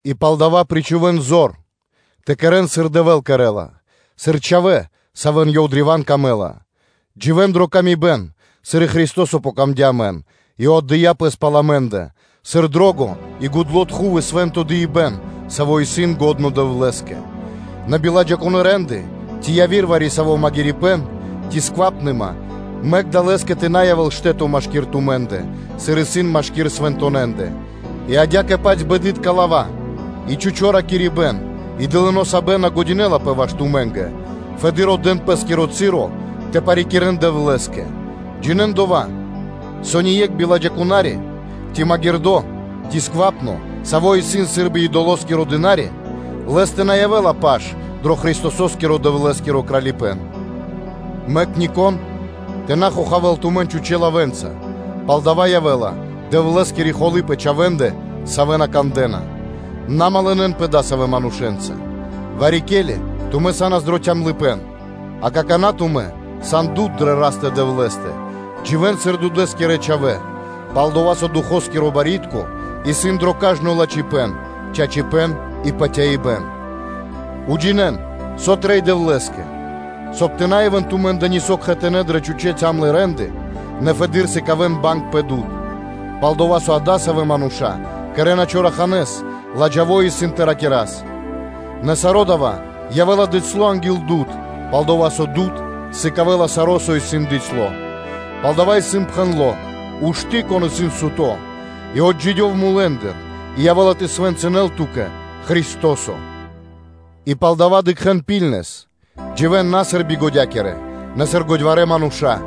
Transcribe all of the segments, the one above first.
И палдава́ причхувэ́н зор тэ кэрэ́н, сыр Дэвэ́л кэрэ́ла, сыр чхавэ́, савэ́ исын Лэ́скэ древа́н дро́га, дживэ́н дрэ паты́в кэ яви́р мануша́, сыр и Христо́со сыкадя́ паты́в амэ́нгэ и отдыя́ Пэс пал амэ́ндэ, сыр гудло́ кхандыпэн и свэ́нто дыибэ́н, саво́ исын лачхо́ Дэвлэ́скэ. Нэ биладжаипэ́н, ци яви́р вари-саво́ магирипэ́н, ци бокхалыпэн, мэк кадалэскэ тэ на явэ́л штэ́то машки́р тумэ́ндэ, сыр исын машки́р свэнтонэ́ндэ; и адя́кэ-паць бэды́тка лава́ и чхучо́ ракирибэ́н и дылыно́ сабэн на джа́ла ваш тумэ́нгэ, фэды́р отдэ́н пэ́скиро часо тэ парикирэ́н Дэвлэ́скэ. Джинэ́н дова́, со ни екх биладжаипна́ри, ци магирдо́, ци бокхало́ кэ яви́р фуй рэ́нды (де́лы), саво́ исын сы́рбы идоло́скиро дына́ри (слуга), лэ́стэ на явэ́ла паш дро Христосо́скиро Дэвлэ́скиро кралипэ́н. Мэк нико́н тэ на хохавэ́л тумэн чхучэ́ (пустонэ) лавэ́нца, пал дава́ явэ́ла Дэвлэ́скири холы́ пэ чхавэ́ндэ, савэ́ на кандэ́на. На явэ́н кхэтанэ́ адасавэ́ манушэ́нца; Вари-ке́ли тумэ́ са́нас дро калыпэ́н (тёмныма), а какана́ тумэ́ сан дуд дрэ Растэ-Дэвлэ́стэ: дживэ́н сыр дудэ́скирэ (свэто́скирэ) чхавэ́, пал-дова́ со Духоскиро барьякирдо́ (пло́до) исын дро кажно лачхипэ́н, чачипэ́н и патяибэ́н, уджинэ́н, со трэй Дэвлэ́скэ; соб (кай) тэ на явэ́л тумэ́ндэ нисо́ кхэтанэ́ дрэ чхучэ́ калэ́ (тёмна) рэ́нды, нэ фэды́р сыкавэ́н банг, пал-дова́ со, со адасавэ́ мануша́ кэрэ́на чораханэ́с, ладжаво-исын тэ ракирас. Нэ саро́ дава́ явэ́ла дыцьло анги́л дуд (свэ́то), пал-дова́ со дуд сыкавэ́ла саро́, со исын дыцьло. Палдава́ исын пхэндло́: “Ушты́, кон исын суто́, и отджидёв, и явэ́ла тэ свэнцынэл ту́кэ Христо́со.” И палдава́ ракхэ́н лачхэ́с, дживэ́н на сыр бигодякирэ, нэ сыр годьварэ́ мануша́.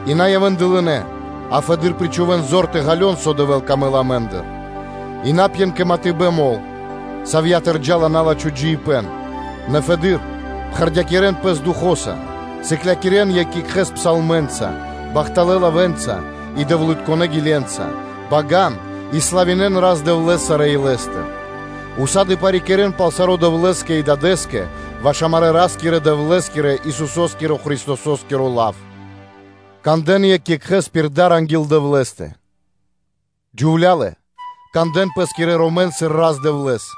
И на явэ́н дылынэ́, а фэды́р причхувэ́н зор тэ ґалён, со Дэвэ́л ужакирэ́ла амэ́ндыр. И на пьен кэ матыбэн мол, савья́тыр джа́ла на́лачхо джиибэ́н, нэ фэды́р пхэрдякирэн пэс Духо́са, сыклякирэ́н екх екхэ́с псалмэнца, бахталэ́ лавэ́нца и Дэвлытконэ́ гиленца, бага́н и славинэ́н Рас-Дэвлэ́с сарэ́ илэ́стыр, усады (сак) парикирэ́н пал саро́ Дэвлэ́скэ и Дадэ́скэ, ваш амарэ́ Ра́скирэ-Дэвлэ́скирэ, Исусо́скиро Христосо́скиро лав, кандэ́н екх екхэ́с пир дар анги́л Дэвлэ́стэ. Джувлялэ, кандэ́н пэскирэн ромэн сыр Рас-Дэвлэ́с,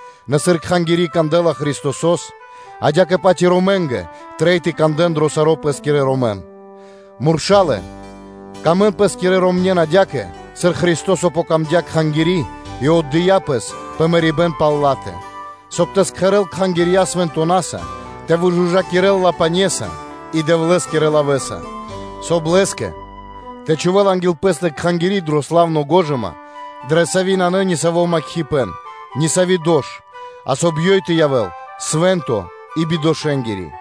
Нэ, сыр Кхангири́ кандэ́ла Христосо́с, адя́кэ-паць и ромненгэ трэй тэ кандэ́н дро саро́ пэ́скирэ ромэн. Мурша́лэ, сыкавэ́н паты́в пэ́скирэ ромне́нгэ адя́кэ, сыр Христо́со сыкадя́ паты́в Кхангирьякэ и отдыя́ Пэс пэ мэрибэ́н пал ла́тэ, соб (кай) тэ кэрэ́л Кхангири́ свэнтонаса, тэ выжужакирэл ла пане́са и Дэвлэ́скирэ лавэ́са, соб (кай) Лэ́скэ тэ чхувэ́л анги́л Пэ́стэ Кхангири́ дро славно гожыма, дрэ сави́ нанэ ни саво́ макхипэн, ни сави́ дош, а соб (кай) ёй тэ явэ́л свэ́нто и бидошэнгири.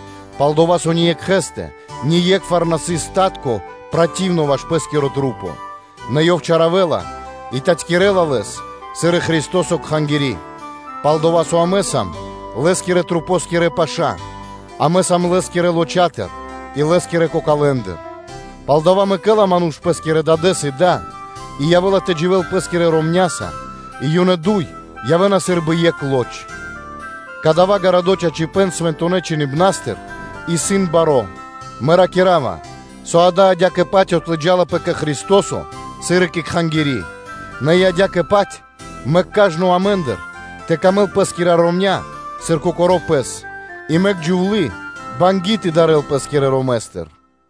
Пал-дова́ со ниекхэскэ ние́кхвар на сыс джунгало́ (брытко) ваш пэ́скири лоч (плоть), нэ ёв чаравэла и татькирэла лэс сыр и Христо́со Кхангири́: пал-дова́ со амэ сам паша́ Лэ́скирэ масэ́ндыр; амэ сам Лэ́скирэ лоча́тыр и Лэ́скирэ кокалэндыр. “Палдава́ мэкэ́ла ману́ш пэ́скирэ дадэ́с и да, и явэ́ла тэ дживэ́л пэ́скирэ ромня́са, и ёнэ дуй явэ́на сы́рбы екх лоч.” Кадава́ гарадо́ чачипэ́н Свэнтонэ́ Чхиныбна́стыр исын баро́; мэ ракира́ва, со дава́ адя́кэ-паць отлыджалапэ кэ Христо́со, сыр и кэ Кхангири́. Нэ и адя́кэ-паць мэк кажно амэ́ндыр тэ сыкавэ́л паты́в пэ́скирэ ромня́кэ, сыр кокоро́ пэ́скэ; и мэк джувлы́ тэ дарэл пэ́скирэ ромэстыр.